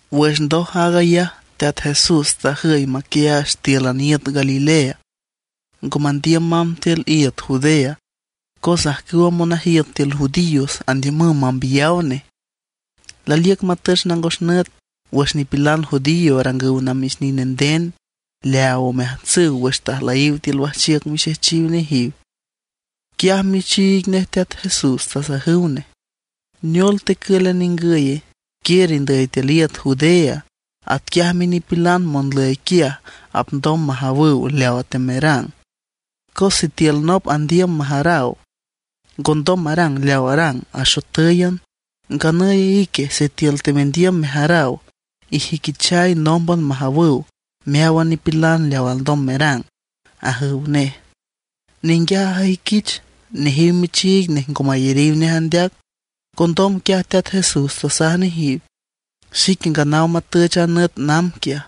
Wüx ndoj aag ayaj, Teat Jesús tajüy maquiaach tíülan iüt Galilea; ngo mandiüm mamb tiül iüt Judea, cos ajcüwa monajiüt tiül judíos andiümüw mambiyaw nej. Laliüc matüch nangos nüt wüx nipilan judío arangüw namix nine nden leaaw omeajtsüw wüx tajlüyiw tiül wajchiüc mixejchiw nejiw. Quiaj michiig nej Teat Jesús tasajüw nej: ―¿Neol tecǘlan ningüye? Quiür indüy tiül iüt Judea; atquiaj minipilan monlüyiw quiaj apndom majawüw leawa teamerang. Cos sitiül nop andiüm majaraw, ngondom marang leaw arang axotǘyan. Nganüy ique sitiül temendiüm mejaraw, ijüiquichay nómban majawüw meáwan nipilan leaw alndom merang ―ajüw nej. Ninguiaj ajüiquich nejiw michiig nej ngo mayariw nej andeac. Condom quiaj Teat Jesús tasaj nejiw: ―Xique nganaw matüch a nüt namb quiaj,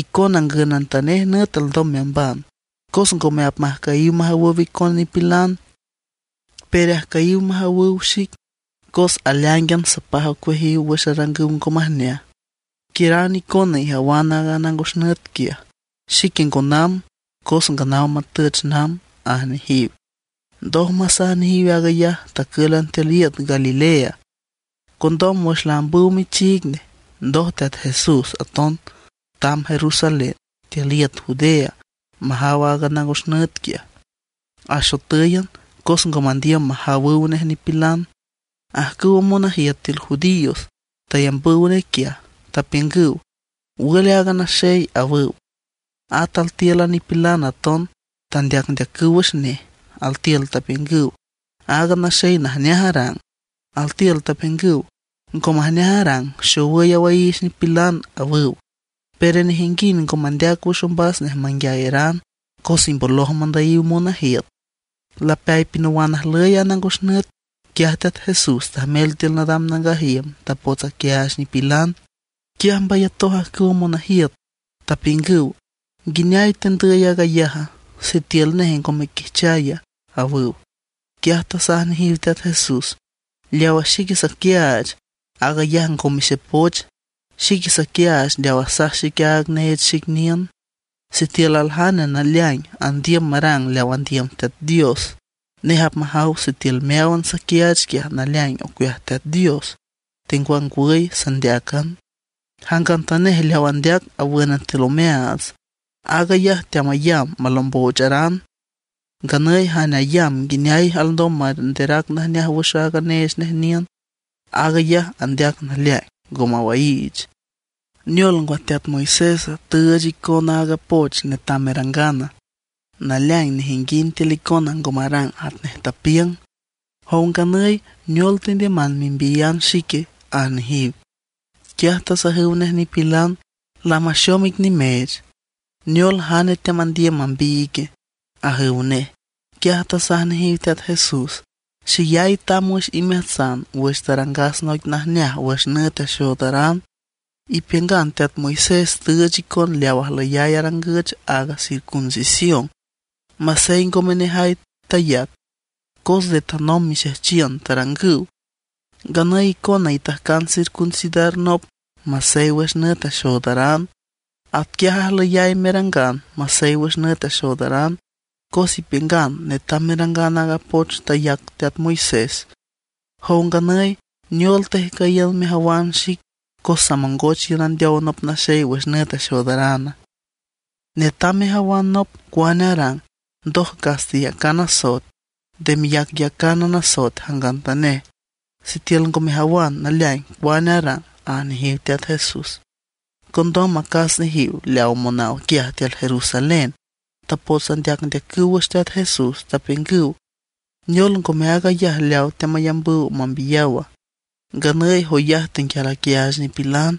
icona ngünantanej nüt alndom meamban. Cos ngome apmajcüyiw majawüw icon nipilan; pero ajcüyiw majawüw xic, cos aleáingan sapaj ocueajiw wüx arangüw ngo majneaj. Quiüran icona ijawan a nangos nüt quiaj; xique ngo namb cos nganaw matüch namb ―aj nejiw. Ndoj masaj nejiw aag ayaj tacǘlan tiül iüt Galilea. Condom wüx laambüw michiig nej, ndoj Teat Jesús aton tamb Jerusalén tiül iüt Judea majaw aaga nangos nüt quiaj, axotǘyan cos ngo mandiüm majawüw nej nipilan. Ajcüwa monajiüt tiül judíos tayambüw nej quiaj, tapiüngüw: ―¿Wül aaga naxey? ―awüw. At tiül a nipilan aton tandeacndeacüw wüx nej. Altiül tapiüngüw: “Aaga naxey najneaj arang”; altiül tapiüngüw: “Ngo majneaj arang, xowüy awaiich nipilan”, awüw. Pero nejinguind ngo mandeac wüx ombas nej manguiayaran, cos imboloj mandüyiw monajiüt. Lapeay pinawan ajlüy a nangos nüt, quiaj Teat Jesús tajmel tiül nadam nangaj iüm, tapots aquiaach nipilan. Quiaj mbayatoj ajcüwa monajiüt, tapiüngüw: ―¿Nguineay tendüy aag ayaja, sitiül nej ngo mequiajchaya? ―awüw. Quiaj tasaj nejiw Teat Jesús: ―Leawa xique saquiaach, aag ayaj ngome xepoch; xique saquiaach leaw asaj xic aaga neech xic niün. Sitiül aljane naleaing andiüm marang leaw andiüm Teat Dios, nej apmajaw sitiül meáwan saquiaach quiaj naleaing ocueaj Teat Dios, tengwangwüy sandeácan. Jangantanej leaw andeac awǘnan tiül omeaats, aag ayaj teamayamb malomboocharan; nganüy jane ayamb nguineay alndom manderac najneaj wüx aaga neech nej miün, aag ayaj andeac naleaing, ngo mawaiich. ’¿Neol ngwa, teat Moisés tüüch icon aaga poch netam merangana? Naleaing nejinguind tiül icona ngo marang atnej tapiüng. Jow nganüy, ¿neol tendiüman membiyan xique? ―aj nejiw. Quiaj tasajüw nej nipilan: ―¡Lamaxom ic nimeech! ¿Neol, jane teamandiüm mambiy ique? ―ajüw nej. Quiaj tasaj nejiw Teat Jesús: ―Xeyay tamb wüx imeajtsan wüx tarangas noic najneaj wüx nüt axoodaran. Ipiüngan teat Moisés tüüch icon leaw ajlüyay arangüch, aaga circuncisión, masey ngome nejay tayac, cos nde tanomb lamarangüw mixejchiün. Nganüy icona itajcan circuncidar nop masey wüx nüt axoodaran. Atquiaj ajlüyay merangan masey wüx nüt axoodaran, cos ipiüngan netam merangan aaga poch tayac teat Moisés. Jow nganüy, ¿neol tejcüyiün mejawan xic cos samongoch iün andeow nop naxey wüx nüt axoodarana? Netam mejawan nop cuane arang, ndoj cas teyacan asoet. Nde meyacyacánan asoet jangantanej sitiül ngo mejawan naleaing cuane arang ―aj nejiw Teat Jesús. Condom acas nejiw leaw monaw quiaj tiül Jerusalén tapots andeacndeacüw wüx Teat Jesús, tapiüngüw: ―¿Neol ngome aag ayaj leaw teamayambüw mambiyawa? Nganüy joyaj tenguial aquiaach nipilan,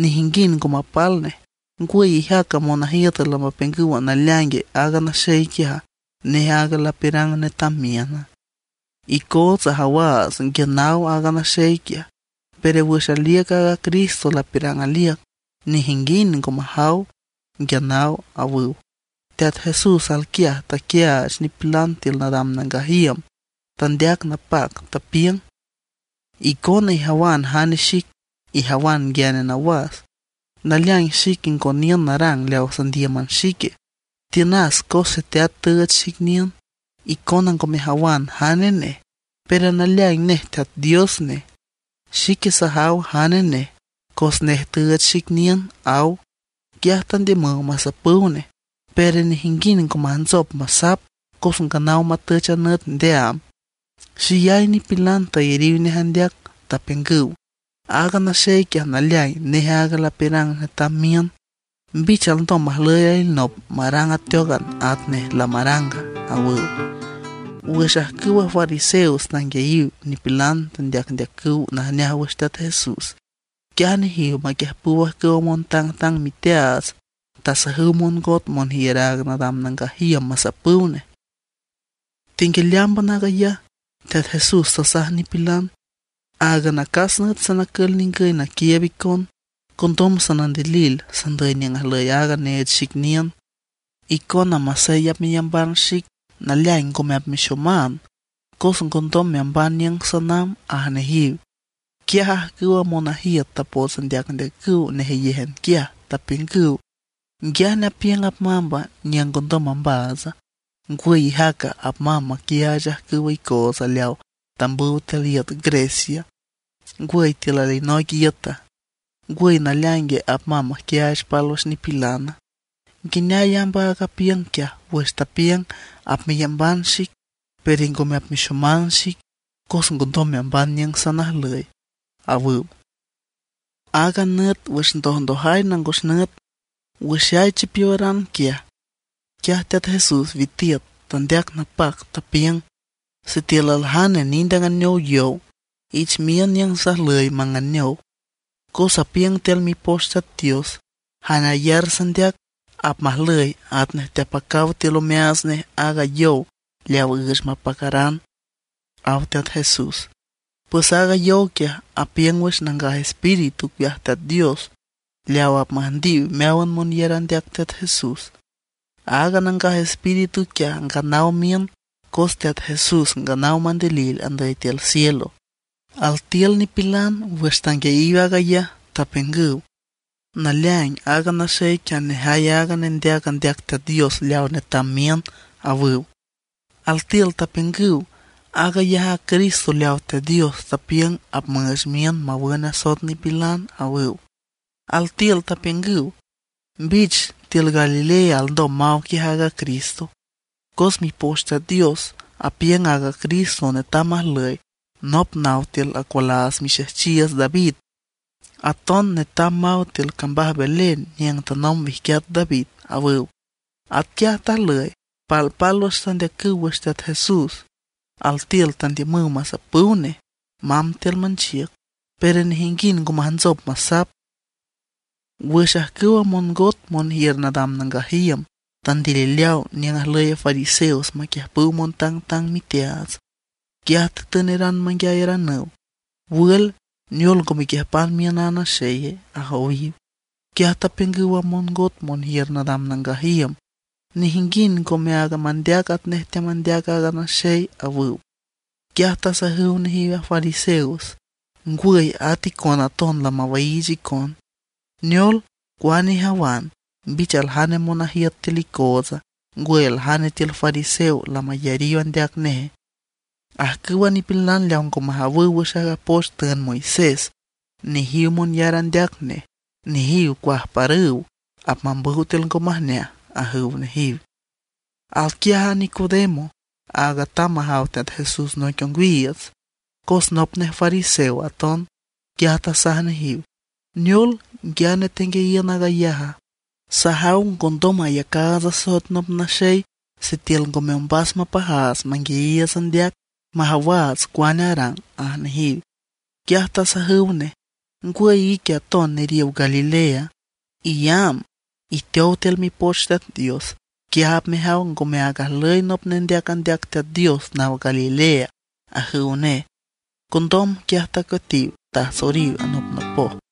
nejinguind ngo mapal nej. ¿Ngwüy ijaca monajiüt lamapiüngüw naleaing aaga naxey quiaj, nej aaga lapiürang netam miüna? Icootsa ajawaats nguia naw aaga naxey quiaj, pero wüx aliüc a Cristo lapiürang aliüc nejinguind ngome apmajaw nguia naw ―awüw. Teat Jesús alquiaj teaquiaach nipilan tiül nadam nangaj iüm; tandeac napac, tapiüng: ―Icona ijawan jane xic; ijawan nguiane nawas. Naleaing xique ngo niün narang leaw sandíüman xique, tiünas cos Xeteat tüüch xic niün. Icona ngo mejawan jane nej, pero naleaing nej Teat Dios nej. Xique sajaw jane nej, cos nej tüüch xic niün ―aw. Quiaj tandiümüw masapüw nej; pero nejinguind ngo majntsop masap cos nganaw matüch a nüt ndeaam. Xeyay nipilan tayariw nej andeac, tapiüngüw: ―Aaga naxey quiaj naleaing nej áag lapiürang netam miün. ¿Mbich alndom majlüy alinop marang ateócan atnej nej lamaranga? ―awüw. Wüx ajcüwa fariseos tanguiayiw nipilan teandeacüw najneaj wüx Teat Jesús, quiaj nejiw maquiüjpüw ajcüwa montangtang miteaats tasajüw mongot monjiür aaga nadam nangaj iüm masapüw nej. Tenguialeámban aag ayaj, Teat Jesús tasaj nipilan: ―Áagan acas nüt sanacül ningüy naquiiüb icon, condom sanandilil sandüy niüng ajlüy aaga neech xic niün. Icona masey apmeyamban xic, naleaing ngome apmexoman, cos ngondom meamban niüng sanamb ―aj nejiw. Quiaj ajcüwa monajiüt tapots andeacndeacüw nejeyéjan quiaj, tapiüngüw: ―¿Nguiane apiüng apmamba niüng ngondom maxomaatsa? ¿Ngwüy ijaca, apmamb maquiaach ajcüwa icootsa leaw tambüw tiül iüt Grecia, ngwüy tiül alinoic iüta; ngwüy naleaingue apmamb maquiaach pálwüx nipilana? ¿Nguineay amb aag apiüng quiaj wüx tapiüng: “Apmeyamban xic pero ngome apmexoman xic, cos ngondom meamban niüng sanajlüy”? ―awüw. Aaga nüt wüx ndojndojay nangos nüt, wüxay chipiowaran quiaj, quiaj Teat Jesús witiüt, tandeac napac, tapiüng: ―Sitiül aljane nind anganeow yow, ich miün niüng sajlüy manganeow. Cos apiüng tiül Mipoch Teat Dios, jane ayar sandeac apmajlüy atnej teapacaw tiül omeaats nej aaga yow leaw üüch mapacaran ―aw Teat Jesús. Pues aaga yow quiaj apiüng wüx Nangaj Espíritu ocueaj Teat Dios leaw apmüjndiw meáwan monyar andeac Teat Jesús. Aaga Nangaj Espíritu quiaj nganaw miün cos Teat Jesús nganaw mandilil andüy tiül cielo. Altiül nipilan wüx tanguiayiw aag ayaj tapiüngüw: ―Naleaing aaga naxey quiaj nejay aaga nendeac andeac Teat Dios leaw netam miün ―awüw. Altiül tapiüngüw: ―Aag ayaj a Cristo leawa Teat Dios tapiüng apmüüch miün mawün asoet nipilan ―awüw. Altiül tapiüngüw: ―¿Mbich tiül Galilea alndom maw quiaj aaga Cristo? Cos Mipoch Teat Dios apiüng aaga Cristo netam majlüy nop naw tiül acualaats mixejchiiüts David. Aton netam maw tiül cambaj Belén niüng tanomb wijquiat David ―awüw. Atquiaj tajlüy, palpálwüx tandeacüw wüx Teat Jesús. Altiül tandiümüw masapüw nej mamb tiül manchiüc, pero nejinguind ngo majntsop masap. Wüx ajcüwa mongot monjiür nadam nangaj iüm tandilileaw niüng ajlüyiw fariseos maquiiüb montangtang miteaats, quiaj tatüneran manguiayaranüw: ―¿Wül, neol ngo mequiüjpan miün a naxeye? ―ajowiw. Quiaj tapiüngüw a mongot monjiür nadam nangaj iüm: ―Nejinguind ngome áag mandeac atnej teamandeac aaga naxey ―awüw. Quiaj tasajüw nejiw a fariseos: ―¿Ngwüy, at icona aton lamawaiich icon? ¿Neol, cuane ijawan, mbich aljane monajiüt tiül icootsa, ngwüy aljane tiül fariseos lamayariw andeac neje? Ajcǘwan a nipilan leaw ngo majawüw wüx aaga poch tüünd Moisés, nejiw monyar andeac nej. Nejiw cuajparüw, apmambüw tiül ngo majneaj ―ajüw nejiw. Alquiaj aaga Nicodemo, áag tamb majaw Teat Jesús noic ongwiiüts, cos nop nej fariseo aton. Quiaj tasaj nejiw: ―¿Neol, nguiane tenguiayiün aag ayaja? Sajaw ngondom mayacaats asoet nop naxey sitiül ngome ombas mapajaats manguiayiiüts andeac, majawaats cuane arang ―aj nejiw. Quiaj tasajüw nej: ―¿Ngwüy ique aton neriow Galilea? Iyamb, iteow tiül Mipoch Teat Dios, quiaj apmejaw ngome áag ajlüy nop nendeac andeac Teat Dios naw Galilea ―ajüw nej. Condom quiaj tacueatiw, tajtsoriw anopnopoj.